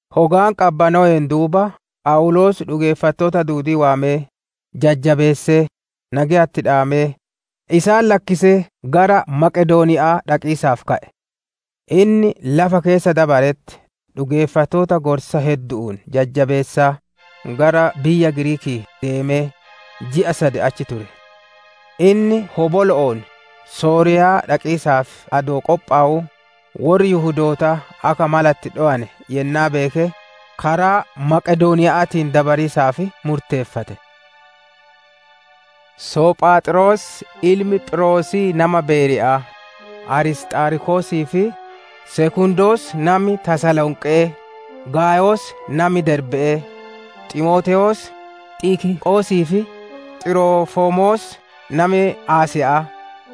Hogaan qabbanoween duuba, Phawuloos dhugeeffattoota duudii waamee, jajjabeessee, nageya itti dhaamee, isaan lakkisee gara Maqedooniya'aa dhaqiisaaf ka'e. Inni lafa keessa dabaretti dhugeeffattoota gorsa heddu'uun jajjabeessaa, gara biyya Giriikii deemee, ji'a sad achi ture. Inni hobolo'oon Sooriyaa dhaqiisaaf adoo qophowuu, worri Yihudootaa akka mala itti dhowe yennaa beeke, karaa Maqedooniya'aatiin deebi'iisaaf murteeffate. Sophaaxros ilmi Phiirosii nami biyya Beeriya'aa, Arisxaarkosii fi Sekundos nami biyya Tasalonqe'ee, Gaayos nami biyya Derbe'ee, Ximootewoos, Xikiqoosii fi Xirofimoos nami biyya Asiya'aa,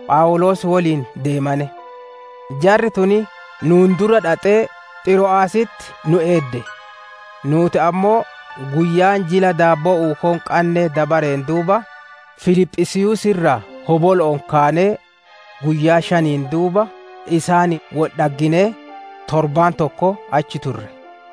Phawuloos woliin deemane. Jarri tun nuun dura dhaxxee Xiro'aasitti nu eedde. Nuuti ammoo guyyaan Jila Daabboo Uukoo hin qanne dabareen duuba, Filiphisiiyuusii irraa hobolo'oon kaanee, guyyaa shaniin duuba isaaniin wol dhagginee, torbaan tokko achi turre.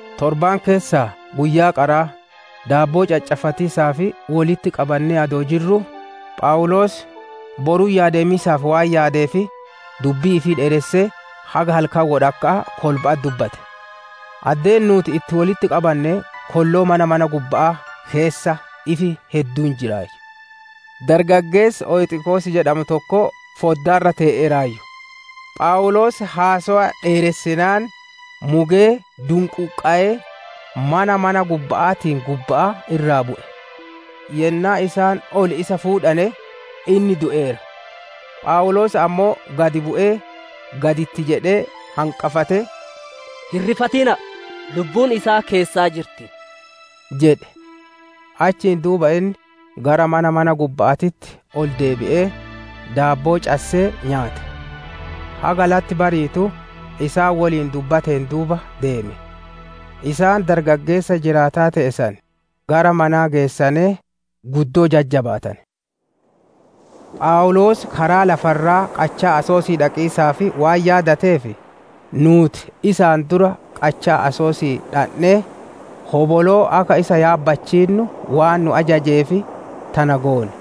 Torbaan keessaa guyyaa qaraa, daabboo caccaffatiisaaf wolitti qabannee adoo jirruu, Phawuloos boruyyaa deemiisaaf waan yaadeef, dubbii ifii dheeressee haga halkan wodhakka'aa kolba'atti dubbate. Addee nuuti wolitti qabanne kolloo mana mana gubba'aa keessa ifi hedduun jiraayyu. Dargaggeessi Oyxikoos jedhamu tokko foddaa irra tee'eeraayyu; Phawuloos haasowa dheeressinaan, mugee dunquuqqayee, mana mana gubba'aatiin gubba'aa irraa bu'e; yennaa isaan ol isa fuudhane, inni du'eera. Phawuloos ammoo gad bu'ee, gad itti jedhee hanqafatee, «Hin rifatina'a! Lubbuun isaa keessaa jirti» jedhe. Achiin duuba inni gara mana mana gubba'aatitti ol deebi'ee, daabboo cassee nyaate; haga latti bariitu isaan woliin dubbateen duuba deeme. Isaan Dargaggeessa jiraataa te'e san gara manaa geessanee, guddoo jajjabaatane. Phawuloos karaa lafa irraa qachaa Asosii dhaqiisaaf waan yaadateef, nuuti isaan dura qachaa Asosii dhandhee, hoboloo akka isa yaabbachiinnu waan nu ajajeef, tana goone.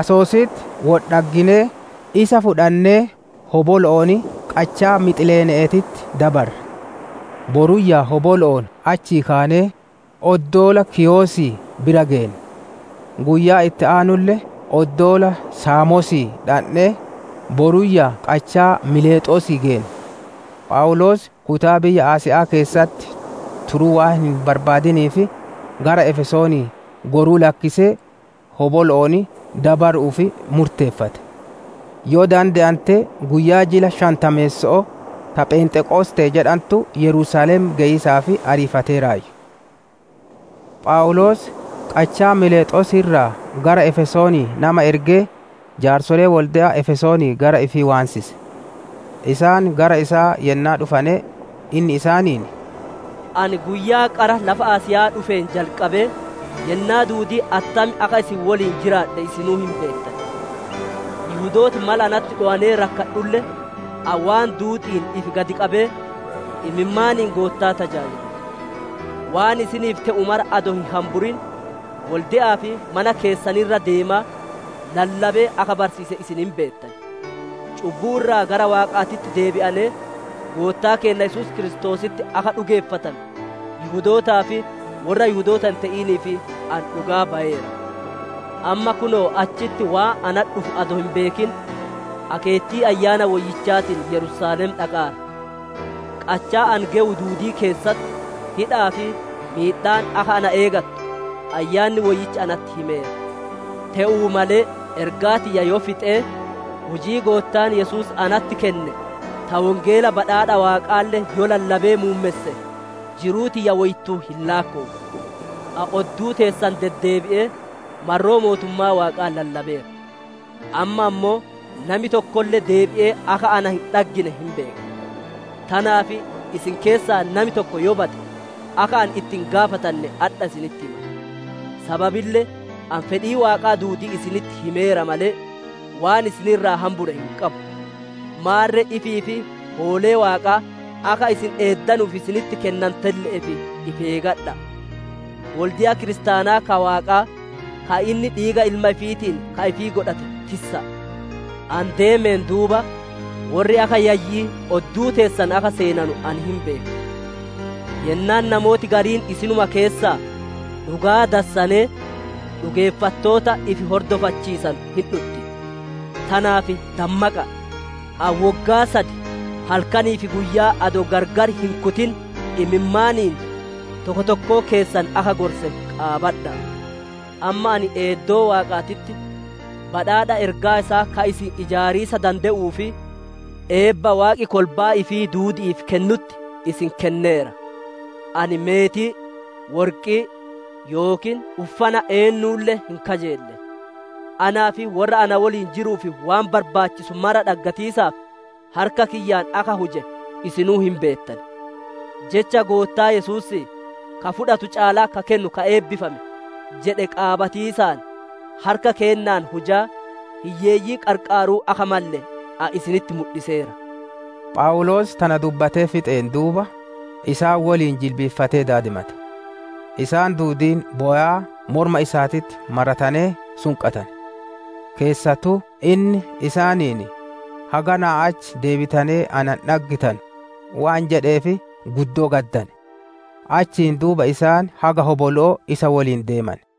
Asositti wol dhagginee, isa fudhannee hobolo'oon qachaa Mixileene'eetitti dabarre. Boruyyaa hobolo'oon achii kaanee, oddoola Kiiyosii bira geenne. Guyyaa itti aanulle oddoola Saamosii dhandhee, boruyyaa qachaa Miilexoosii geenne. Phawuloos kutaa biyya Asiya'aa keessatti turuu waan hin barbaadiniif, gara Efesoonii goruu lakkisee, hobolo'oon dabaru'uuf murteeffate. Yoo dande'ante guyyaa jila shantameesso'oo ta «Phenxeqosxee» jedhantu Yerusaalem geyiisaaf ariifateeraayyu. Phawuloos qachaa Miilexoosii irraa gara Efesoonii nama ergee, Jaarsolee wolde'a Efesoonii gara ifii waansise. Isaan gara isaa yennaa dhufane, inni isaaniin, «Ani guyyaa qara lafa Asiya'aa dhufeen jalqabee, yennaa duudii attam akka isin woliin jiraadhe isinuu hin beettan. Yihudooti mala natti dhowanee rakkadhulle, ani waan duudi'iin ifi gad qabee, imimmaaniin Goottaa tajaajile. Waan isiniif te'u mara adoo hin hamburin, wolde'aa fi mana keessan irra deemaa, lallabee akka barsiise isin hin beettan. Cubbuu irraa gara Waaqaatitti deebi'anee, Goottaa keenna Yesuus Kiristoositti akka dhugeeffatanu, Yihudootaa fi worra Yihudoota hin te'iniif ani dhugaa bayeera. Amma kunoo achitti waan natti dhufu adoo hin beekin, akeettii Ayyaana Woyyichaatiin Yerusaalem dhaqaara. Qachaa ani gewu duudii keessatti hidha'aa fi miidhaan akka ana eegattu, Ayyaanni Woyyichi natti himeera. Te'uu malee ergaa tiyya yoo fixee, hujii Goottaan Yesuus natti kenne ta Wongeela badhaadha Waaqaalle yoo lallabee muummesse, jiruu tiyya woyittuu hin laakkowu. «Ani odduu teessan deddeebi'ee, marroo mootummaa Waaqaa lallabeera; amma ammoo, nami tokkolle deebi'ee akka na hin dhaggine hin beeka. Tanaaf isin keessaa nami tokko yoo bade, akka ani itti hin gaafatanne adha isinitti hima. Sababille ani fedhii Waaqaa duudii isinitti himeera malee, waan isin irraa hambure hin qabu. Maarre ifii fi hoolee Waaqaa akka isin eeddanuuf isinitti kennantelle'eef ifi eegadha'a; wolde'a kiristaanaa ka Waaqaa, ka inni dhiiga ilma ifiitiin ka ifii godhate tissa'a. Ani deemeen duuba, worri akka yayyi'ii odduu teessan akka seenanu ani hin beeka. Yennaan namooti gariin isinuma keessaa, dhugaa dassanee dhugeeffattoota ifi hordofachiisanu hin dhutti. Tanaaf dammaqa'a! Ani woggaa sad halkanii fi guyyaa adoo gargar hin kutin imimmaaniin, tokko tokkoo keessan akka gorse qaabadha'a. «Amma ani eeddoo Waaqaatitti, badhaadha ergaa isaa ka isin ijaariisa dande'uu fi eebba Waaqi kolbaa ifii duudi'iif kennutti, isin kenneera. Ani meetii, worqii yookiin uffana eennulle hin kajeelle. Anaa fi worra na woliin jiruuf waan barbaachisu maraa dhaggatiisaaf harka kiyyaan akka huje isinuu hin beettan. Jecha Goottaa Yesuusii, ‹Ka fudhatu caalaa ka kennu ka eebbifame› jedhe qaabatiisaan, harka keennaan hujaa, hiyyeeyyii qarqaaruu akka malle ani isinitti mudhiseera» jedhe. Phawuloos tana dubbatee fixeen duuba, isaan woliin jilbiiffatee daadimate. Isaan duudiin bowaa morma isaatitti maratanee sunqatane. Keessattuu inni isaaniin, haganaa achii deebitanee na hin dhaggitanu waan jedheef guddoo gaddane; achiin duuba isaan haga hobolo'oo isa woliin deemane.